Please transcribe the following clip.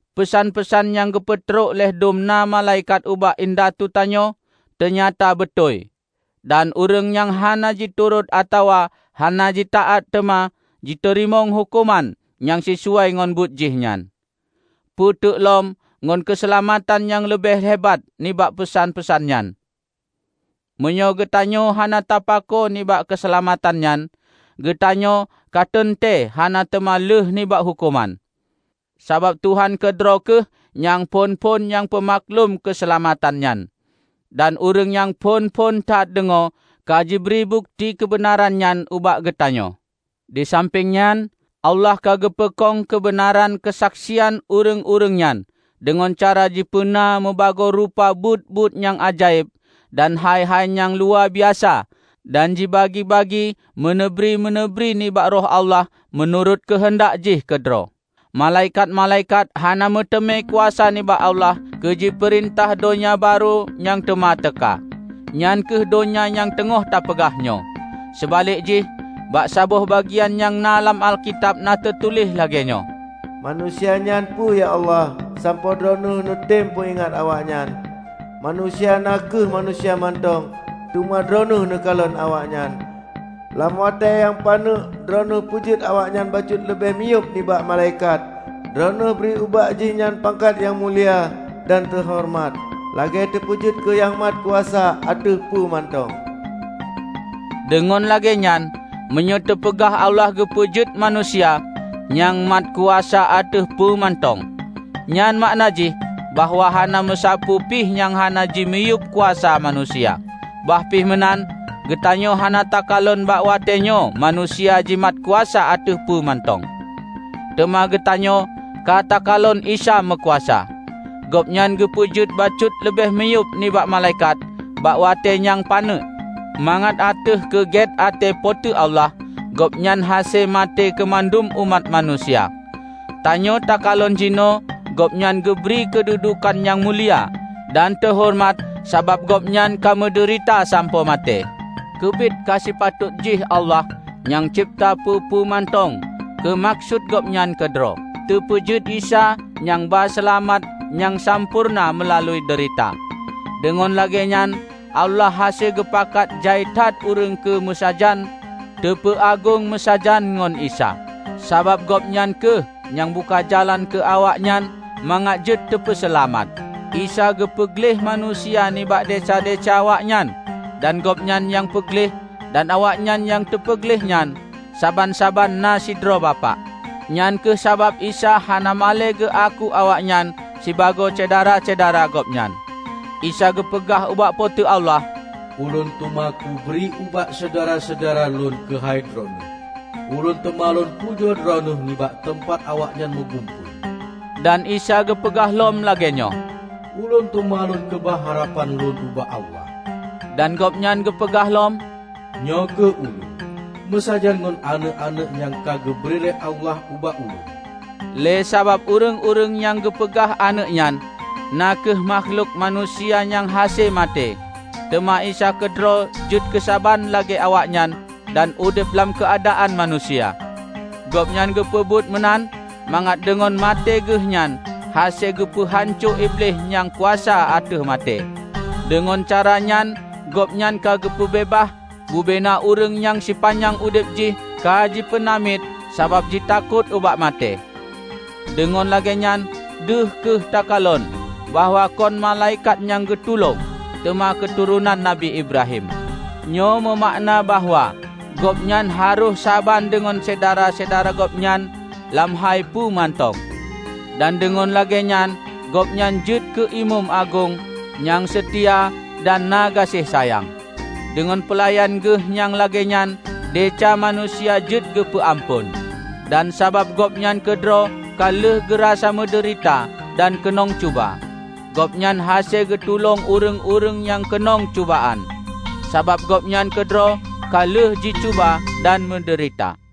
Peusan-peusan nyang geupeutrok lé dum na malaikat ubak indatu tanyoe teunyata beutôi, dan ureuëng nyang hana jiturot atawa hana jitaát teuma jiteurimong huköman nyang sisuai ngon buet jih nyan. Peue teuk lom ngon keuseulamatan nyang leubeh hebat nibak peusan-peusan nyan! Meunyoe geutanyoe hana tapako nibak keuseulamatan nyan, geutanyoe ka teuntée hana teuma lheuh nibak huköman. Sabab Tuhan keudroe kheueh nyang phon-phon nyang peumaklum keuseulamatan nyan, dan ureuëng nyang phon-phon that deungoe ka jibri bukeuti keubeunaran nyan ubak geutanyoe. Disampéng nyan, Allah ka geupeukong keubeunaran keusaksian ureuëng-ureuëng nyan deungon cara jipeuna mubagoe rupa buet-buet nyang ajaéb dan hai-hai nyang luwabiasa dan jibagi-bagi meuneubri-meuneubri nibak Roh Allah meunurot keuheundak jih keudroe. Malaikat-malaikat hana meuteumé kuasa nibak Allah keu jipeurintah donya barô nyang teuma teuka, nyan kheueh donya nyang teungoh tapeugah nyoe. Seubalek jih, bak saboh bagian nyang na lam Alkitab na teutuléh lagée nyoe, "Manusia nyan peue, ya Allah, sampoe Droeneueh neutem peuingat awaknyan? Manusia na kheueh manusia mantong, teuma Droeneueh neukalon awaknyan! Lam watée nyang paneuk Droeneueh peujeuet awaknyan bacut leubeh miyueb nibak malaikat. Droeneueh bri ubak jihnyan pangkat nyang mulia dan teuhoreumat, lagée teupeujeuet keu nyang mat kuasa ateueh peue mantong." Deungon lagée nyan, meunyoe teupeugah Allah geupeujeuet manusia "nyang mat kuasa ateueh peue mantong", nyan makna jih bahwa hana meusapeue pi nyang hana dimiyueb kuasa manusia. Bah pih meunan, geutanyoe hana takalon bak watée nyoe manusia jimat kuasa ateueh peue mantong. Teuma geutanyoe ka takalon Isa meukuasa! Gobnyan geupeujeuet bacut leubeh miyueb nibak malaikat bak watée nyang paneuk, mangat ateueh keu gét até Po teu Allah Gobnyan hase maté keumandum umat manusia. Tanyoe takalon jinoe Gobnyan geubri keududukan nyang mulia dan teuhoreumat sabab Gobnyan ka meudeurita sampoe maté. Keubiet ka sipatot jih Allah -- nyang cebta peue-peue mantong keu meukeusut Gobnyan keudroe -- teupeujeuet Isa nyang ba seulamat nyang sampoereuna meulalu deurita. Deungon lagée nyan Allah hase geupakat jai that ureuëng keu meusajan teupeuagong meusajan ngon Isa. Sabab Gobnyan kheueh nyang buka jalan keu awaknyan mangat jeuet teupeuseulamat. Isa geupeu gleh manusia nibak desya-desya awaknyan; dan Gobnyan nyang peugleh, dan awaknyan nyang teupeugleh nyan, saban-saban na sidroe Bapak. Nyang kheueh sabab Isa hana malée geuaku awaknyan sibagoe syedara-syedara Gobnyan. Isa geupeugah ubak Po teu Allah, "Ulôn teuma kubri ubak syedara-syedara Lôn keuhai Droeneueh. Ulôn teuma lôn pujoe Droeneueh nibak teumpat awaknyan meugumpôi." Dan Isa geupeugah lom lagée nyoe, "Ulôn teuma Lôn keubah harapan Lôn ubak Allah." Dan Gobnyan geupeugah lom, "Nyoe kheueh Ulôn, meusajan ngon aneuëk-aneuëk nyang ka geubri lé Allah ubak Ulôn." Lé sabab ureuëng-ureuëng nyang geupeugah aneuëk nyan, na kheueh makhlok manusia nyang hase maté, teuma Isa keudroe jeuet keu saban lagée awaknyan dan udeb lam keuadaan manusia. Gobnyan geupeubuet meunan, mangat deungon maté Geuhnyan hase geupeu hanco Iblih nyang kuasa ateueh maté. Deungon cara nyan Gobnyan ka geupeubeubaih bubena ureuëng nyang sipanyang udeb jih ka jipeunamiet sabab jitakot ubak maté. Deungon lagée nyan deuh kheueh takalon bahwa kon malaikat nyang geutulông, teuma keuturonan Nabi Ibrahim. Nyoe meumakna bahwa Gobnyan harôh saban deungon syedara-syedara Gobnyan lam hai peue mantong. Dan deungon lagée nyan Gobnyan jeuet keu Imeum Agong nyang seutia dan na gaséh sayang. Deungon peulayan Geuh nyang lagée nyan desya manusia jeuet geupeu amphon. Dan sabab Gobnyan keudroe ka lheueh geurasa meudeurita dan keunong cuba, Gobnyan hase geutulông ureuëng-ureuëng nyang keunong cubaan, sabab Gobnyan keudroe ka lheueh jicuba dan meudeurita.